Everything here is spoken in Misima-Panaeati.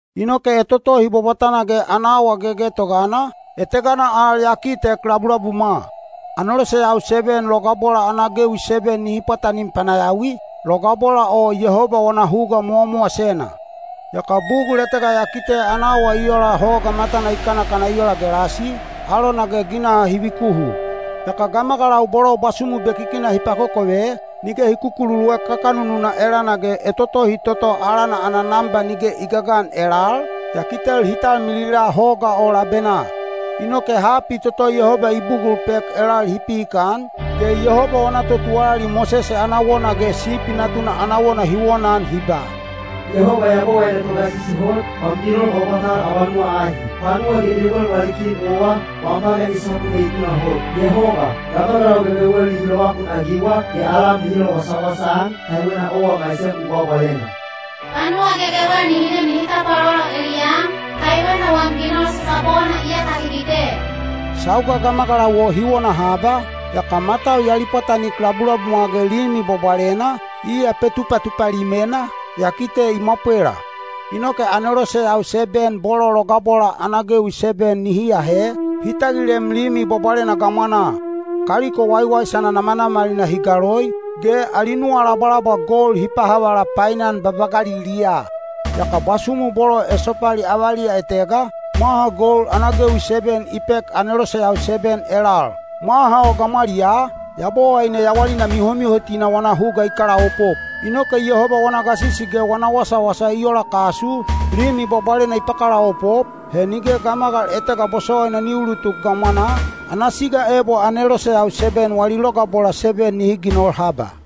Inoke etotohi bwabwatana ge ana awa gegetogana, etegana al ya kitek labulabumwa: aneloseyau seben logabola ana gewi seben nihi pwatanim panayawi, logabola o Yehoba wana huga mowamowasena. Yaka bugul etega ya kite ana awa i ola hoga matana i kanakana i ola gelasi, alona ge ginaha hi vikuhu. Yaka gamagalau bolo bwasumu bekikina hi pakokove, nige hi kukululuek kakanununa elana ge etotohi toto alana ana namba nige i gagan elal, ya kitel hi talmilila hoga o labenaa. Inoke hapi toto Yehoba i bugul pek elal hi pihikan, ge Yehoba wana totuwalali Mosese ana wona ge Sipi Natuna ana wona hi wonaan hi ba: “Yehoba Yabowaine Togasisi Hot, wam ginol bwabwatal abanuwa ahi. Panuwa gegewel wali Kin owa, wam pagan i sapu ge i tunahot. Yehoba, gamagalau gegewel nihi lovakunagiwa, ge alam nihi lowasawasa-an, kaiwena owa maisem u bwabwalena. Panuwa gegewel nihi nem ge nihi tapwalolo eliyam, kaiwena wam ginol sasapona iyaka hi kite.” Sauga gamagalau o hi wona haba, yaka matau ya lipwatanik labulabumwa ge Limi Bwabwalena, iya Petupatupa Limena, ya kite i mwapwela. Inoke aneloseyau seben bolo logabola ana gewi seben nihi ahe, hi tagilem Limi Bwabwalena gamwanaa. Kaliko waiwaisana namanamalina hi galoi, ge ali nuwalabwalabwa gold hi pahavala painan babagaliliyaa. Yaka bwasumu bolo esopali avaliya etega, mwaha gold ana gewi seben i pek aneloseyau seben elal. Mwaha o gamwaliyaa, Yabowaine yawalina mihomihotina wana huga i kalaopop. Inoke Yehoba wana gasisi ge wana wasawasa i ola kasu, Limi Bwabwalena i pakalaopop, he nige gamagal etega bosowaina ni ulutuk gamwanaa, ana siga ebo aneloseyau seben wali logabola seben nihi ginol haba.